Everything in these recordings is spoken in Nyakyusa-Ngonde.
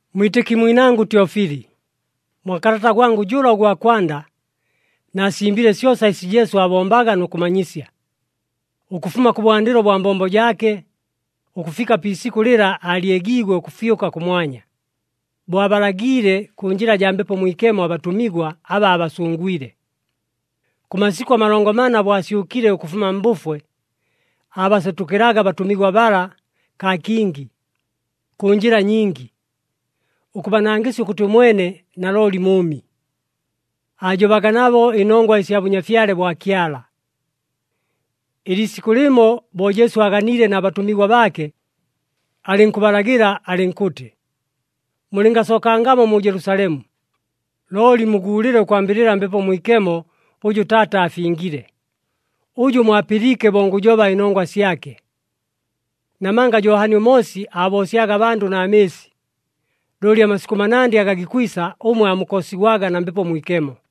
Mwitɨki mwinangʉ Tyofili, mwa kalata gwangʉ jʉla ʉgwa kwanda, naasimbile syosa ɨsi Jesu aabombaga nʉ kʉmanyisya, ʉkʉfuma kʉbwandɨlo bwa mbombo jaake, ʉkʉfika pi isikʉ lɨla aalyegiigwe ʉkʉfyʉka kʉmwanya, bo abalagiile kʉ njɨla jaa Mbepo Mwikemo abatʉmigwa aba aabasʉngwile. Kʉ masikʉ amalongo mana bo asyʉkile ʉkʉfuma mbʉfwe, aabasetʉkɨlaga abatʉmigwa bala kaa kingi, kʉ njɨla nyingi, ʉkʉbanangɨsya ʉkʉtɨ ʉmwene nalooli mʉʉmi. Aajobaga nabo ɨnongwa ɨsya Bʉnyafyale bwa Kyala. Ɨliisikʉ lɨmo, bo Jesu aaganiile na batʉmigwa baake, alɨnkʉbalagɨla alɨnkʉtɨ, “Mulɨngasookangamo mu Jelusalemu, looli muguulɨle ʉkwambɨlɨla Mbepo Mwikemo ʉjʉ Taata aafingile, ʉjʉ mwapɨliike bo ngʉjoba ɨnongwa syake. Namanga Johani ʉMoosi aaboosyaga abandʉ na mɨɨsi, looli amasikʉ manandɨ aga gikwisa, ʉmwe aamukoosigwaga na Mbepo Mwikemo.”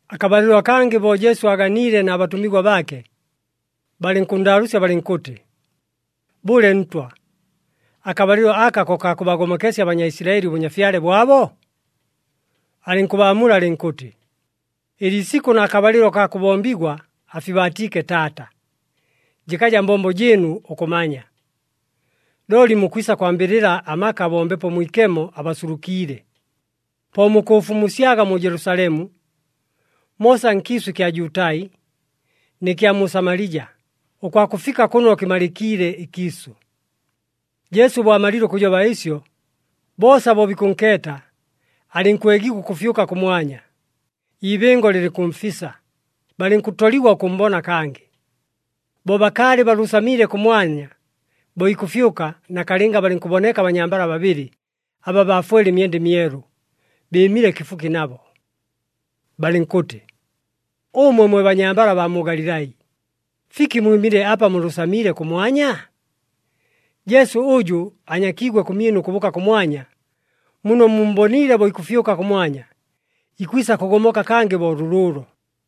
Akabalɨlo akangɨ bo Jesu aaganiile na batʉmigwa baake, balɨnkʉnndaalʉʉsya balɨnkʉtɨ, “Bʉle Ntwa, akabalɨlo aka ko kaa kʉbagomokesya aBanyaisilaɨli ʉbʉnyafyale bwabo?” Alɨnkʉbaamula alɨnkʉtɨ, “Ɨliisikʉ na kabalɨlo kaa kʉbombigwa, afibaatiike Taata, jɨkaja mbombo jɨɨnu ʉkʉmanya. Looli mukwisa kwambɨlɨla amaka bo Mbepo Mwikemo abasulukiile, po mukʉʉfumusyaga mu Jelusalemu, moosa nkiisʉ ɨkya Jutai nɨ kya mu Samalija, ʉkwakʉfika kʉno kɨmalɨkiile ɨkiisʉ.” Jesu bo amalile ʉkʉjoba ɨsyo, boosa bo bikʉnkeeta, alɨnkwegigwa ʉkʉfyʉka kʉmwanya, ibɨngo lɨlɨnkʉmfisa, balɨnkʉtoligwa ʉkʉmmbona kangɨ. Bo bakaalɨ balʉʉsamiile kʉmwanya, bo ikʉfyʉka, nakalɨnga balɨnkʉboneka abanyambala babɨlɨ aba baafwele ɨmyenda ɨmyelu, bɨɨmile kɨfuki nabo. Balɨnkʉtɨ, “Ʉmwe mwe banyambala baa mu Galilai, fiki mwɨmile apa mulʉʉsamiile kʉmwanya? Jesu ʉjʉ anyakiigwe kʉmyɨnu ʉkʉbʉʉka kʉmwanya, muno mummboniile bo ikʉfyʉka kʉmwanya, ikwisa kʉgomoka kangɨ bo lʉlʉʉlo.”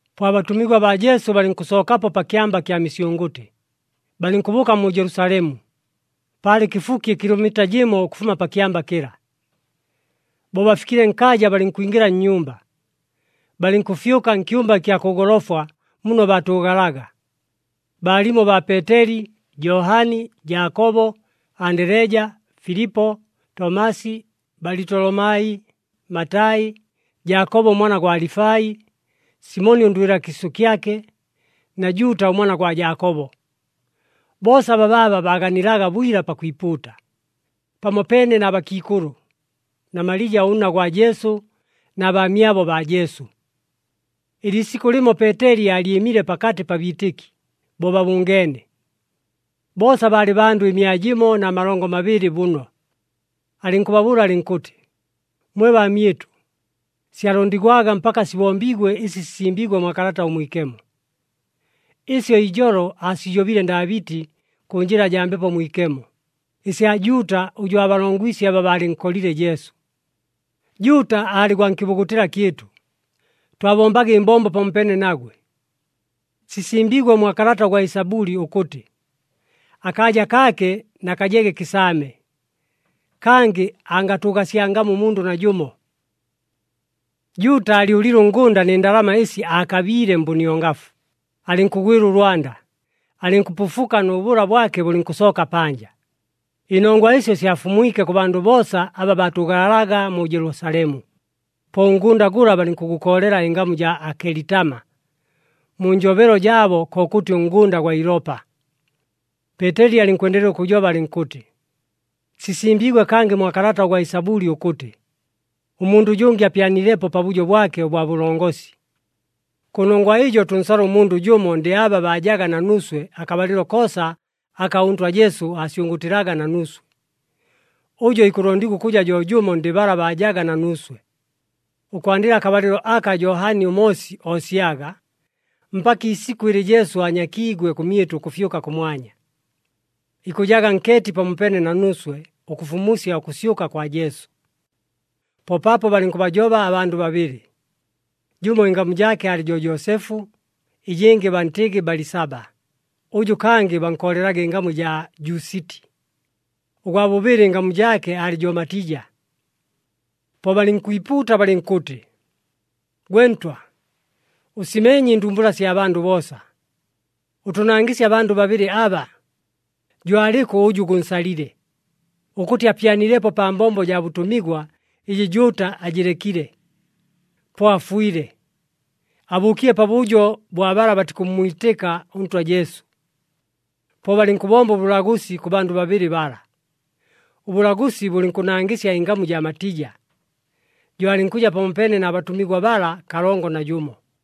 Po abatʉmigwa baa Jesu balɨnkʉsookapo pa Kyamba kya Misyʉngʉtɨ, balɨnkʉbʉʉka mu Jelusalemu, paalɨ kɨfuki ɨkilomita jɨmo ʉkʉfuma pa kyamba kɨla. Bo bafikile nkaaja balɨnkwingɨla nnyumba, balɨnkʉfyʉka nkyumba ɨkya kʉ golofwa muno baatʉʉgalaga. Baalimo baa Peeteli, Johani, Jaakobo, Andeleja, Filipo, Tomasi, Balitolomai, Matai, Jaakobo ʉmwana gwa Alifai, Simoni ʉndwɨla kiisʉ kyake, na Juuta ʉmwana gwa Jaakobo. Boosa babaaba baaganilaga bwila pakwipuuta, pamopeene na bakiikʉlʉ, na Malija ʉnna gwa Jesu, na baamyabo baa Jesu. Ɨliisikʉ lɨmo Peeteli aalyɨmile pakatɨ pa biitɨki, bo babʉngeene. Boosa baalɨ bandʉ ɨmia jɨmo na malongo mabɨlɨ bʉno. Alɨnkʉbabʉʉla alɨnkʉtɨ, “Mwe baamyɨtʉ, syalondigwaga mpaka sibombiigwe ɨsi sisimbiigwe mwa Kalata ʉMwikemo. Ɨsyo ijolo aasijobile Ndaabɨti kʉ njɨla jaa Mbepo Mwikemo, ɨsya Juuta ʉjʉ aabalongwisye aba baalɨnkolile Jesu. Juuta aalɨ gwa nkɨbugutɨla kyɨtʉ, twabombaga ɨmbombo pamopeene nagwe. Sisimbiigwe mwa kalata ʉgwa Ɨsabʉli ʉkʉtɨ, ‘Akaaja kaake na kajege kɨsaame, kangɨ angatʉʉgasyangamo ʉmundʉ najʉmo.’” (Juuta aalyʉlile ʉngʉnda nɨ ndalama ɨsi aakabiile mbʉniongafu, alɨnkʉgwɨla ʉlwanda, alɨnkʉpʉfuka nʉ bʉla bwake bʉlɨnkʉsooka panja. Ɨnongwa ɨsyo syafumwike kʉ bandʉ boosa aba baatʉʉgalaga mu Jelusalemu, po ʉngʉnda gʉla balɨnkʉgʉkoolela ɨngamu jaa Akelitama, mu njobelo jaabo kokʉtɨ ʉNgʉnda gwa Ilopa.) Peeteli alɨnkwendelela ʉkʉjoba alɨnkʉtɨ, “Sisimbiigwe kangɨ mwa kalata gwa Ɨsabʉli ʉkʉtɨ, ‘Ʉmundʉ ʉjʉngɨ apyanilepo pabʉjo bwake ʉbwa bʉlongosi.’ “Kʉnongwa ɨjo tʉnsale ʉmundʉ jʉmo ndɨ aba baajaga na nuuswe akabalɨlo koosa aka ʉNtwa Jesu asyʉngʉʉtɨlaga na nuuswe. Ʉjo ikʉlondigwa ʉkʉja jo jʉmo ndɨ bala baajaga na nuuswe, ʉkwandɨla akabalɨlo aka Johani ʉMoosi oosyaga, mpaka iisikʉ ɨlɨ Jesu aanyakiigwe kʉmyɨtʉ ʉkʉfyʉka kʉmwanya. Ikʉjaga nkeeti pamopeene na nuuswe ʉkʉfumusya ʉkʉsyʉka kwa Jesu.” Po paapo balɨnkʉbajoba abandʉ babɨlɨ. Jʉmo ɨngamu jaake aalɨ jo Joosefu, ɨjɨngɨ bantɨgɨ Balisaba, ʉjʉ kangɨ bankoolelaga ɨngamu ɨjaa Jusiti. Ʉgwa bʉbɨlɨ, ɨngamu jaake aalɨ jo Matija. Po balɨnkwipuuta balɨnkʉtɨ, “Gwe Ntwa, ʉsimeenye ɨndumbula sya bandʉ boosa. Ʉtʉnangɨsye abandʉ babɨlɨ aba, jo alɨkʉ ʉjʉ gʉnsalile, ʉkʉtɨ apyanilepo pa mbombo jaa bʉtʉmigwa ɨjɨ Juuta aajɨlekile, po afwile, abʉʉkile pabʉjo bwa bala batikʉmmwitɨka ʉNtwa Jesu.” Po balɨnkʉbomba ʉbʉlagʉsi kʉ bandʉ babɨlɨ bala. Ʉbʉlagʉsi bʉlɨnkʉnangɨsya ɨngamu jaa Matija, jo alɨnkʉja pamopeene na batʉmigwa bala kalongo na jʉmo.